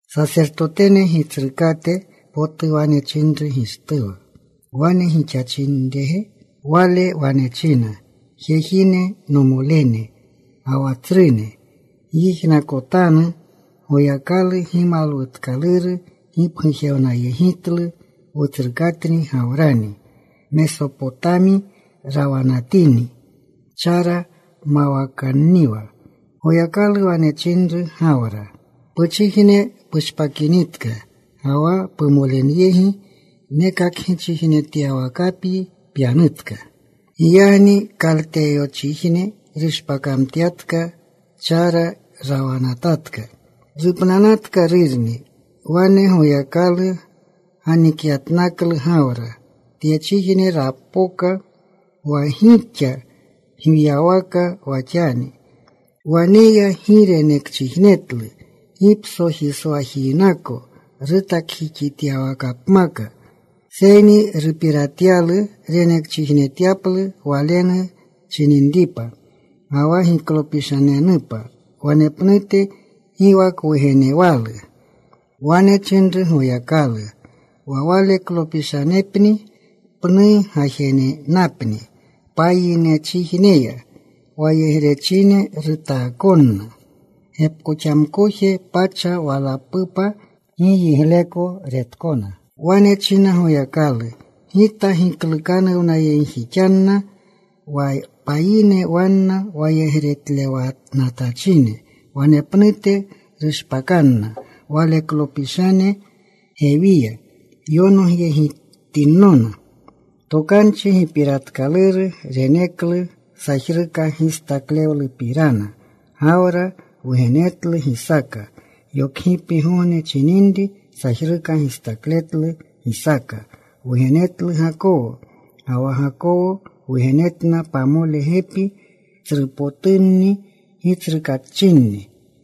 Sasertotene Gitsrukate potu wane chinru Gishtuwa, “¿Wane gixachrirge?” Wale wane china, “Jejine, nomolene, ga wa tsrune, Gyijnakotanu. Goyakalu gimalwutkaluru gipgujewnayegitlu wutsrukatni Gawrani. Mesopotami rawanatini. Chara mawakanniwa. Goyakalu wane chinru Gawra, ‘Puchijne pushpakinitka, ga wa pumolenyegiya. Nekakgichijnetyawakapyi pyanutka.’ “Giyagni Kalteyonchijne rushpakamtyatka. Chara rawanatatka. Rupnanatka rurni. Wane Goyakalu ganikyatnaklu Gawra. Tyechijne rapoka wa gixa gwiyawaka wa xani. Waneya gi renekchijnetlu, gi psojiswajinako rutakjixityawakapmaka. Seyni rupiratyalu renekchijnetyaplu walenu chininripa, ga wa giklopishanenupa wanepnute. Gi wa kwugenewalu. Wane chinru Goyakalu wa waleklopishanepni pnu gajenenapni payinchijneya. Wayegrechine rutaakonna. Gepkoxamkoje pacha walapupa gi yigleko retkona. “Wane china Goyakalu, ‘Gita giklukanuwnayegjixanna wa payine wanna wayegretlewanatachine. Wanepnute rushpakanna waleklopishane. Gewiya yonogyegitinnona.’ “Tokanchi gipiratkaluru reneklu, sajruka gistaklewlupirana. Gawra wugenetlu Gisaaka. Yokgipgogne chininri sajruka gistakletlu. Gisaaka wugenetlu Gakowo. Ga wa Gakowo wugenetna pamole gepi tsrupotunni gitsrukaachinni.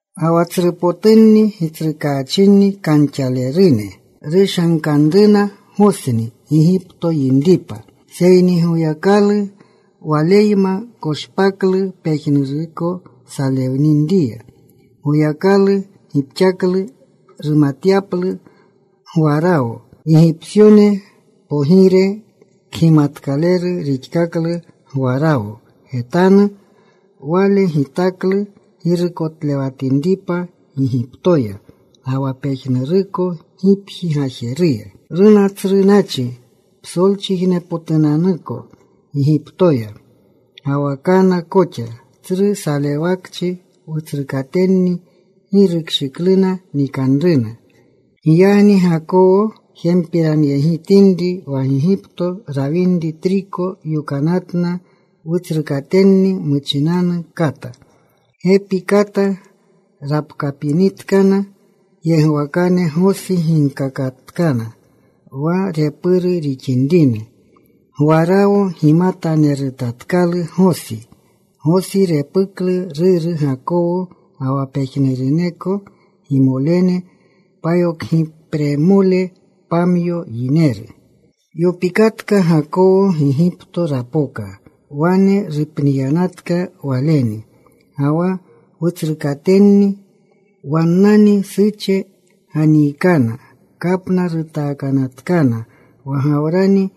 “Ga wa tsrupotunni gitsrukaachinni kanxalerune rushankanruna Gosni Gigipto yinripa. Seyni Goyakalu waleyma. Koshpaklu pejnuruko salewninriya. Goyakalu gipxaklu rumutyaplu Gwarawo, Gigipsyone pogire. Kgimatkaleru rixkaklu Gwarawo getanu. Wale gitaklu girukotlewatinripa Gigiptoya ga wa pejnuruko gipji gajeruya. “Runa tsru nachi psolchijnepotunanuko Gigiptoya, ga wa Kana koxa. Tsru salewakchi. Wutsrukatenni gi rukshikluna nikanruna. Giyagni Gakowo jempiranyegitinri wa Gigipto rawinri triko, yokanatna wutsrukatenni muchinanu kata. Gepi kata rapkapinitkana yegwakane. Gosi ginkakatkana wa repurna rixinrina. Gwarawo gimatanerutatkalu Gosi. Gosi gepuklu ruru Gakowo ga wa pejnuruneko gimolene, payokgipremole pamyo yineru. “Yopikatka Gakowo. Gigipto rapoka. Wane rupniyanatka waleni ga wa wutsrukatenni. Wannani Suche ganiikana. Kapna rutaakanatkana wa Gawrani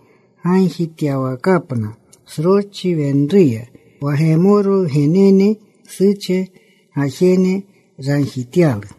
gagjityawakapna sroschi wenruya. Wa Gemoro wgenene, Suche gajene ragjityalu.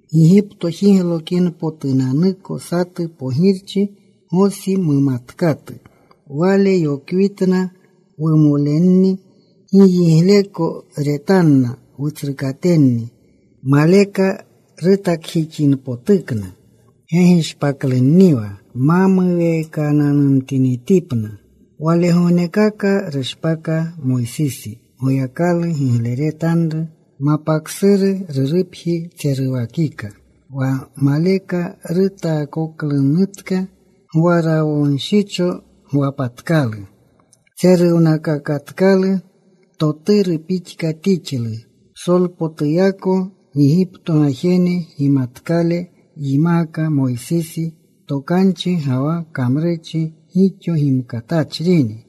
Gigipto jiglokinpotunanuko satu pogirchi Gosi mumatkatu. Wale yokwitna wumolenni. Gi yigleko retanna wutsrukatenni. Maleka rutakjixinpotukna gegishpaklunniwa ma muweekananumtinitipna. “Walegognekaka rushpaka Moysisi. Goyakalu gigleretanru. Mapa ksuru rurupji tseruwakika. Wa maleka rutaakoklunutka, Gwarawonshicho gwapatkalu. Tseruwakatkalu. Toturu pixka tixlu. Psolpotuyako Gigipto gajene gimatkale yimaaka Moysisi. Tokanchi ga wa kamrurchi gixo gimkatachrini.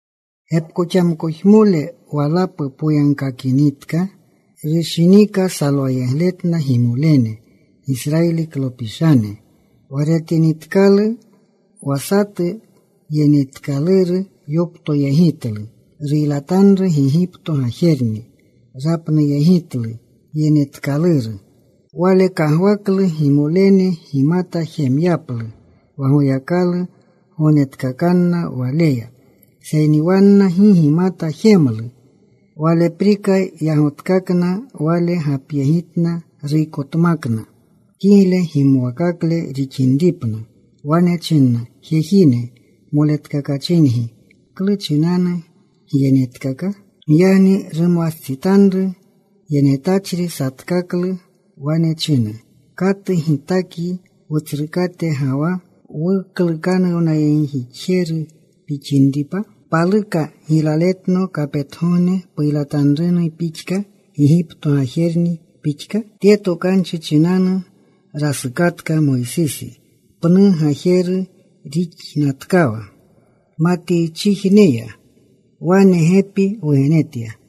“Gepkoxamkojemole walapu poyagkakinitka rushinika salwayegletna gimolene, Gisrayiliklopishane. Wa retinitkalu wa satu yenetkaluru, yoptoyegitlu. Ruylatanru Gigipto gajerni. Rapnuyegitlu yenetkaluru. Wale kagwaklu gimolene gimata jemyaplu wa Goyakalu gognetkakanna waleya. Seyni wanna gi gimata jemlu. Waleprika yagotkakna. Wale gapyegitna. Ruykotmakna kigle gimwakakle rixinripna. Wane china, ‘Jejine, moletkakachingi. ¿Klu chinanu gyenetkaka?’ “Giyagni rumwastsitanru yenetachri satkaklu. Wane china, ‘¿Katu gitakyi wutsrukate ga wa wuklukanuwnayegjixjeru pixinripa? ¿Paluka giylaletno kapetgogne puylatanruna pixka Gigipto gajerni pixka?’ “Tye tokanchi chinanu rasukatka Moysisi. Pnu gajeru rixnatkawa Matiychijne ya. Wane gepi wugenetya.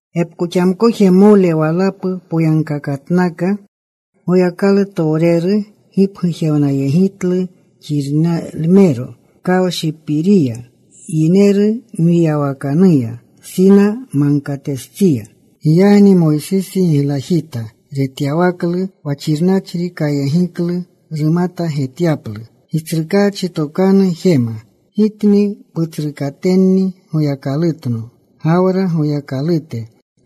“Gepkoxamkojmole walapu poyagkakatnaka. Goyakalutowreru gipgujewnayegitlu xirnalmero kawshipiriya, yineru mwiyawakanuya Sina Magkatestsiya. Giyagni Moysisi giglajita retyawaklu wa xirnachri. Kayegiklu rumata getyaplu. Gitsrukaachi tokanu jema, ‘Gitni putsrukatenni Goyakalutno, Gawra Goyakalute,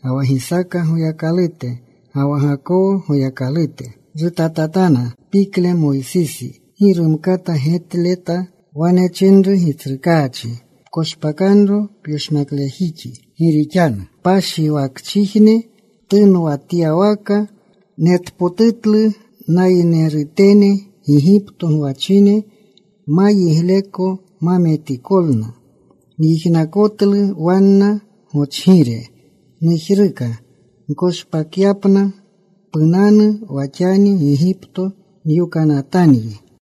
ga wa Gisaaka Goyakalute, ga wa Gakowo Goyakalute.’ “Rutatatana pikle Moysisi. Gi rumkata getleta. Wane chinru Gitsrukaachi, ‘Pkoshpakanro pyoshmaklejixi. Gi rixanu kpashiwakchijne ptunwatyawaka. Netpotutlu nayinerutene Gigipto gwachine ma yigleko ma metikolna. Nyijnakotlu wanna gochgire. Nujruka nkoshpakyapna. Punanu wa xani. Gigipto nyokanatanyi.’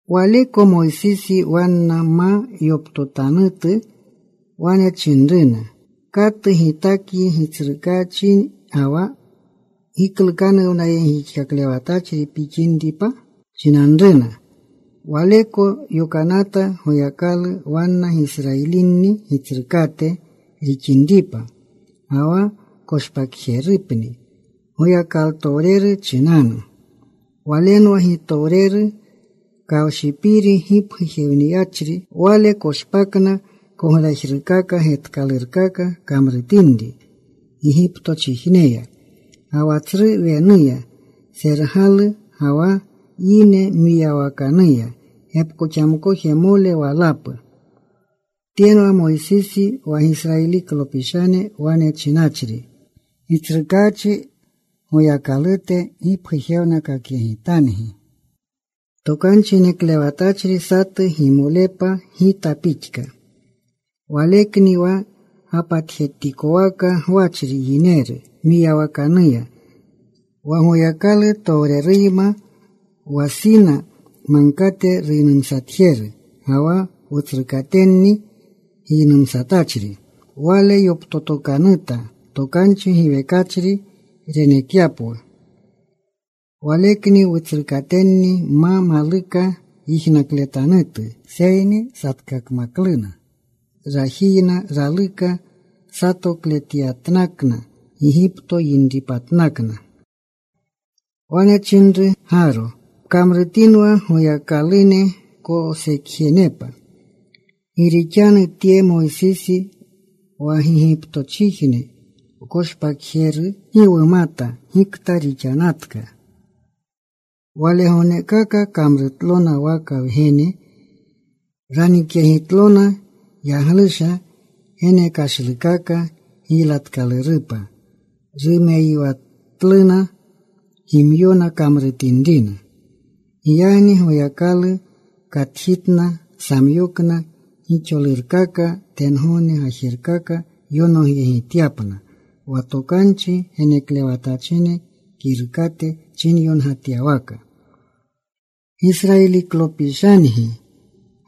“Waleko Moysisi wanna ma yoptotanutu—wane chinanruna, ‘¿Katu gitakyi gitsrukaachi ga wa giklukanuwnayegjixlewatachri pixinripa?’ chinanruna. Waleko yokanata Goyakalu, wanna Gisrayilini gitsrukate rixinripa, ga wa koshpakjerepni Goyakalutowreru chinanu. Walenwa gitowreru, kawshipiri gipgujewniyachri. Wale koshpakna, koglajrukaka getkalurkaka kamrutinri Gigiptochijneya, ga wa Tsru Wenuya Sergalu, ga wa yineru mwiyawakanuya gepkoxamkojmole walapu. Tyenwa Moysisi wa Gisrayiliklopishane wane chinachri, ‘Gitsrukaachi Goyakalute gipgujewnakakyegitangi Tokanchi Geneklewatachri satu gimolepa gita pixka.’ Walekni wa gapatikowaka gwachri yineru mwiyawakanuya, wa Goyakalu towreruyma, wa Sina Magkate ruynumsatjeru, ga wa wutsrukatenni giynumsatachri. Wale yoptotokanuta tokanchi giwekachri renekyapwu. Walekni wutsrukatenni ma maluka yijnakletanutu, seyni satkakmakluna. Rajiyna raluka satokletyatnakna, Gigipto yinripatnakna. “Wane chinruna Gaaro, ‘Pkamrutinwu goyakalune wkosekjenepa. Gi rixanu tye Moysisi wa Gigiptochijne wkoshpakapjeru, gi wumata gikta rixanatka.’ Walegognekaka kamrutlona waka wgene. Ranikyegitlona yaglusha genekashlukaka giylatkalurupa. Rumeyiwakatluna gimyona kamrutinrina. “Giyagni Goyakalu katjitna. Samyokna gixolurkaka tengogne gajerkaka yonogyegityapna. Wa tokanchi geneklewatachine kirukate chinyongatyawaka: Gisrayiliklopishangi,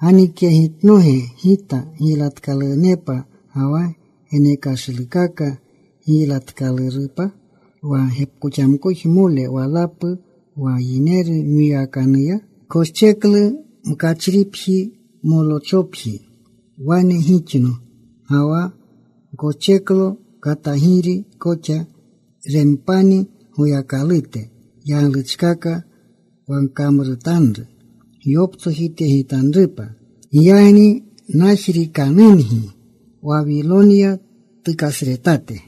¿Ganikyegitnoge Gita giylatkalunepa ga wa genekashlukaka giylatkalurupa wa gepkoxamkojmole walapu wa yineru mwiyawakanuya? Gkoscheklu mkachripji Molochopji. Wane gixno, ga wa gkoscheklo katagiri koxa, Rempanni goyakalute. yagluchkaka wa gkamrutanru gyoptsojityegitanrupa. Giyagni najriikanungi Wawilonya tukasretate.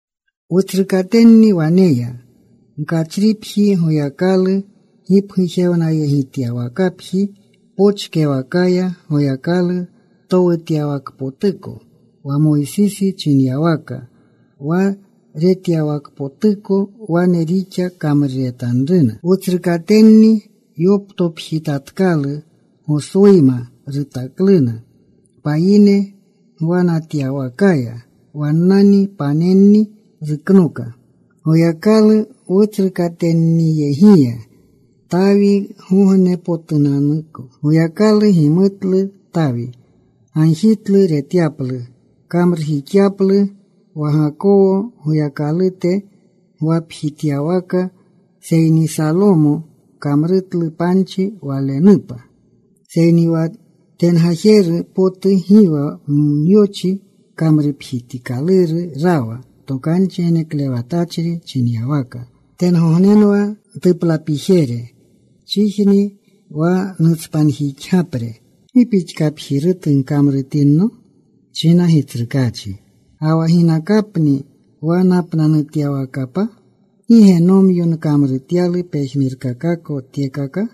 “Wutsrukatenni waneya mkachripji Goyakalu gipgujewnajetyawakapji pochkewakaya. Goyakalu towutyawakpotuko. Wa Moysisi chinyawaka wa retyawakpotuko, wane rixa kamruretanruna. Wutsrukatenni yoptopjitatkalu. Goswuyma rutakluna payine gwanatyawakaya. Wannani panenni ruknoka Goyakalu wutsrukatenniyegiya, Tawigognepotunanuko. Goyakalu gimutlu. Tawi gagjitlu retyaplu, kamrujixyaplu wa Gakowo Goyakalute gwapjityawaka. Seyni Salomo kamrutlu panchi Walenupa. “Seyni wa tengajeru potu gi wa myochi kamrupjitikaluru rawa. Tokanchi geneklewatachri chinyawaka: ‘Tengognenwa ntuplapijere. Chijni wa nutspanjixgapre. ¿Gi pixkapjirutu gkamrutinno?’ china Gitsrukaachi. ‘¿Ga wa ginakapni wa napnanutyawakapa? ¿Gi ge nomyo nkamrutyalu pejnurkakako tyekaka?’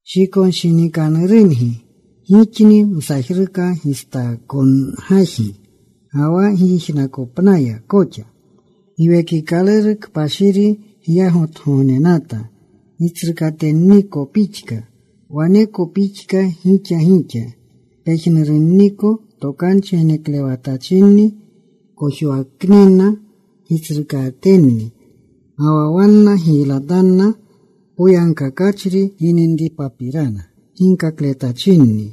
“Shikonshinikanurungi. Gixni msajruka gistaakongajgi ga wa gijnakopnaya koxa. Giwekikaluru Kpashiri gyagotgognenata, gitsrukatenniko pixka. Waneko pixka gixa gixa. Pejnurunniko tokanchi geneklewatachinni kojwaknina gitsrukatenni. Ga wa wanna giylatanna Poyagkakachri gininripapirana ginkakletachinni.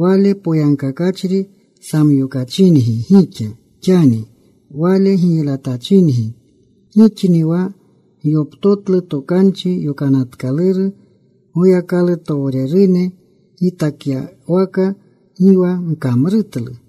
Wale Poyagkakachri samyokachingi gixa xani. Wale giylatachingi. Gixni wa gyoptotlu Tokanchi Yokanatkaluru Goyakalutowrerune gitakyawaka. Gi wa gkamrutlu.”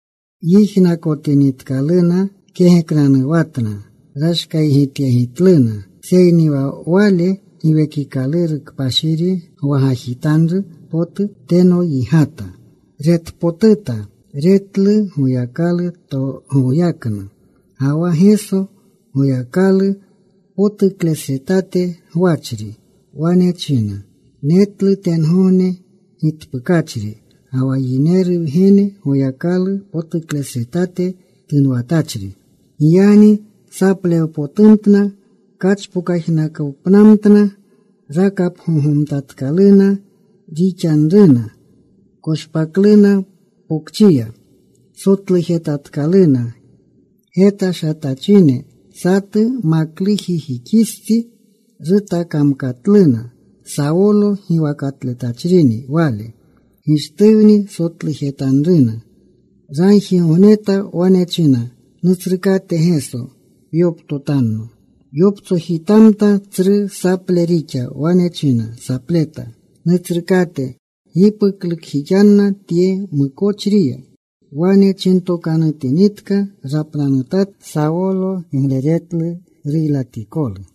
Yijnakotinitkaluna kegeknanuwatna. Rashkaygityegitluna. Seyni wa wale, Giwekikaluru Kpashiri gwagajitanru potu, teno yigata. Retpotuta. Retlu Goyakalu goyaknu, ga wa Geso Goyakalu potuklesretate gwachri. Wane china, “Netlu tengogne gitpukachri, ga wa Yineru Wgene Goyakalu potuklesretate tunwatachri.” Giyagni saplewpotumtna. Kachpokajnakopnamtna. Pagakapgogomtkalune rixanruna. Koshpakluna pokchiya. Sotlujetanatkaluna. Getashanatachine satu maklujijixistsi rutakamkatluna. Sawolo giwakatletachrini wale. Gishtuwni sotlujetanruna. Ragjigogneta. Wane china, “Nutsrukate Geso, pyoptotanno.” Yoptsojitamta. Tsru saple rixa. Wane china sapleta, “Nutsrukate, gi puklukjixanna tye mukochriya.” Wane chintokanutinitka rapnanutatka. Sawolo gigleretlu ruylatikolu.